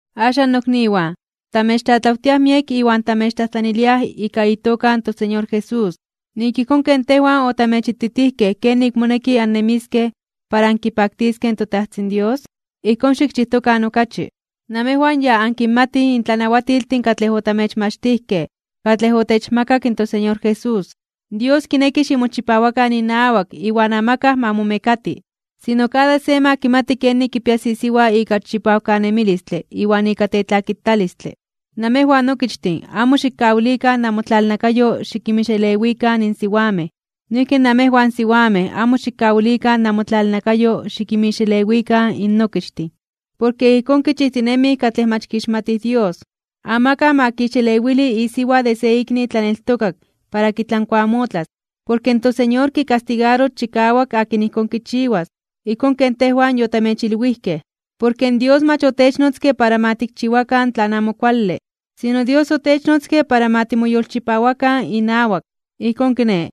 Axan, nokniwan, tamechtlatlawtiaj miek iwan tamechtlajtlaniliaj ika itoka in toSeñor Jesús, nik ijkón ken tejwan otamechititijkej kenik moneki annemiskej para ankipaktiskej in toTajtzin Dios, ijkón xikchijtokan okachi. Namejwan ya ankinmatij in tlanawatiltin katlej otamechmachtijkej katlej otechmakak in toSeñor Jesús. Dios kineki ximochipawakan inawak iwan amakaj ma momekati. Sino kada se ma kimati kenik kipias isiwa ika chipawkanemilistle iwan ika tetlakitalistle. Namejwan okichtin amo xikkawilikan namotlalnakayo xikinmixelewikan in siwamej. Noijki namejwan siwamej amo xikkawilikan namotlalnakayo xikinmixelewikan in okichtin. Porke ijkón kichijtinemij katlej mach kixmatij Dios. Amakaj ma kixelewili isiwa de se ikni tlaneltokak para kitlankuamotlas, porke in toSeñor kikastigaros chikawak akin ijkón kichiwas, ijkón ken tejwan yotamechilwijkej. Porke Dios mach otechnotzke para ma tikchiwakan tlan amo kuale, sino Dios otechnotzke para ma timoyolchipawakan inawak. Ijkón kiné,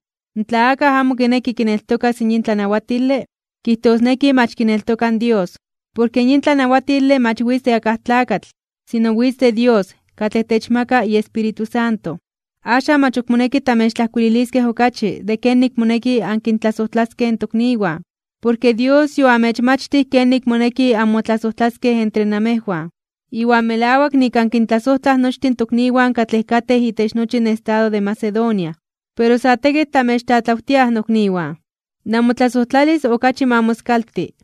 tla akaj amo kineki kineltokas in yin tlanawatile, kijtosneki mach kineltoka in Dios. Porke yin tlanawatile mach witz de akaj tlakatl, sino witz de Dios, katlej techmaka iEspíritu Santo. Axan, mach ok moneki tamechtlajkuililiskej okachi de kenik moneki ankintlasojtlaskej in tokniwan, porke Dios yoamechmachtij kenik moneki anmotlasojtlaskej entre amejwan. Iwan melawak nik ankintlasojtlaj nochtin in tokniwan katlej katej itech nochi in estado de Macedonia. Pero sa tekitl tamechtlatlawtiaj, nokniwan, namotlasojtlalis okachi ma moskalti.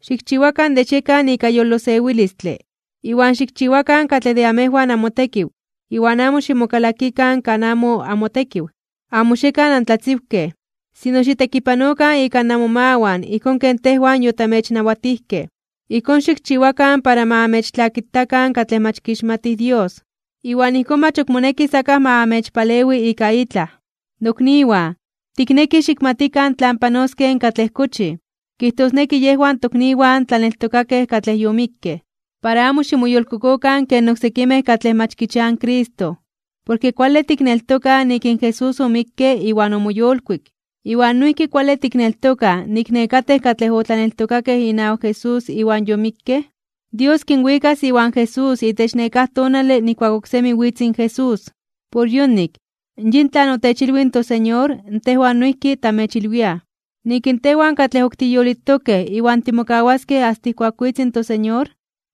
Xikchiwakan de xiekan ika yolosewilistle, iwan xikchiwakan katlej de amejwan amotekiw iwan amo ximokalakikan kan amo amotekiw. Amo xiekan antlatziwkej, sino xitekipanokan ika namomawan ijkón ken tejwan yotamechnawatijkej. Ijkón xikchiwakan para ma amechtlakitakan katlej mach kixmatij Dios, iwan ijkón mach ok monekis akaj ma amechpalewi ika itlaj. Nokniwan, tiknekij xikmatikan tlan panoskej katlej kochij, kijtosneki yejwan tokniwan tlaneltokakej katlej yomikkej. Para amo ximoyolkokokan ken oksekimej katlej mach kichiaj in Cristo. Porke kuale tikneltokaj nik in Jesús omikke iwan omoyolkuik, iwan noijki kuale tikneltokaj nik nekatej katlej otlaneltokakej inawak Jesús iwan yomikkej, Dios kinwikas iwan Jesús itech nekáj tonale nijkuak oksemi witz in Jesús. Por yonik, yin tlan otechilwij in toSeñor tejwan noijki tamechilwiaj, nik in tejwan katlej ok tiyolitokej iwan timokawaskej asta ijkuak witz in toSeñor,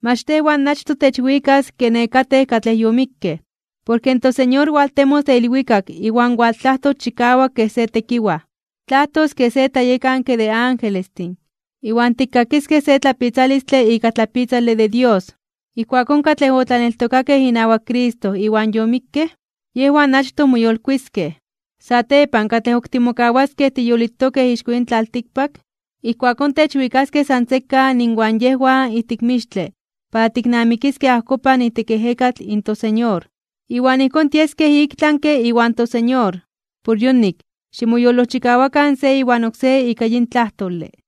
mach tejwan achtoj techwikas ke nekatej katlej yomikkej. Porke in toSeñor waltemos de ilwikak iwan waltlajtos chikawak kej se tekiwaj. Tlajtos kej se tlayekanke de angelestin, iwan tikkakiskej se tlapitzalistle ika tlapitzale de Dios. Ijkuakón katlej otlaneltokakej inawak Cristo iwan yomikkej, yejwan achtoj moyolkuiskej (moyolitiskej). Satepan katlej ok timokawaskej tiyolitokej ixko yin tlaltikpak, ijkuakón techwikaskej san sekan inwan yejwan ijtik mixtle para tiknamikiskej ajkopan ijtik ejekatl in toSeñor. Iwan ijkón tieskej iktlanke (ik tlami) iwan toSeñor. Por yonik, ximoyolojchikawakan se iwan oksé ika yin tlajtole.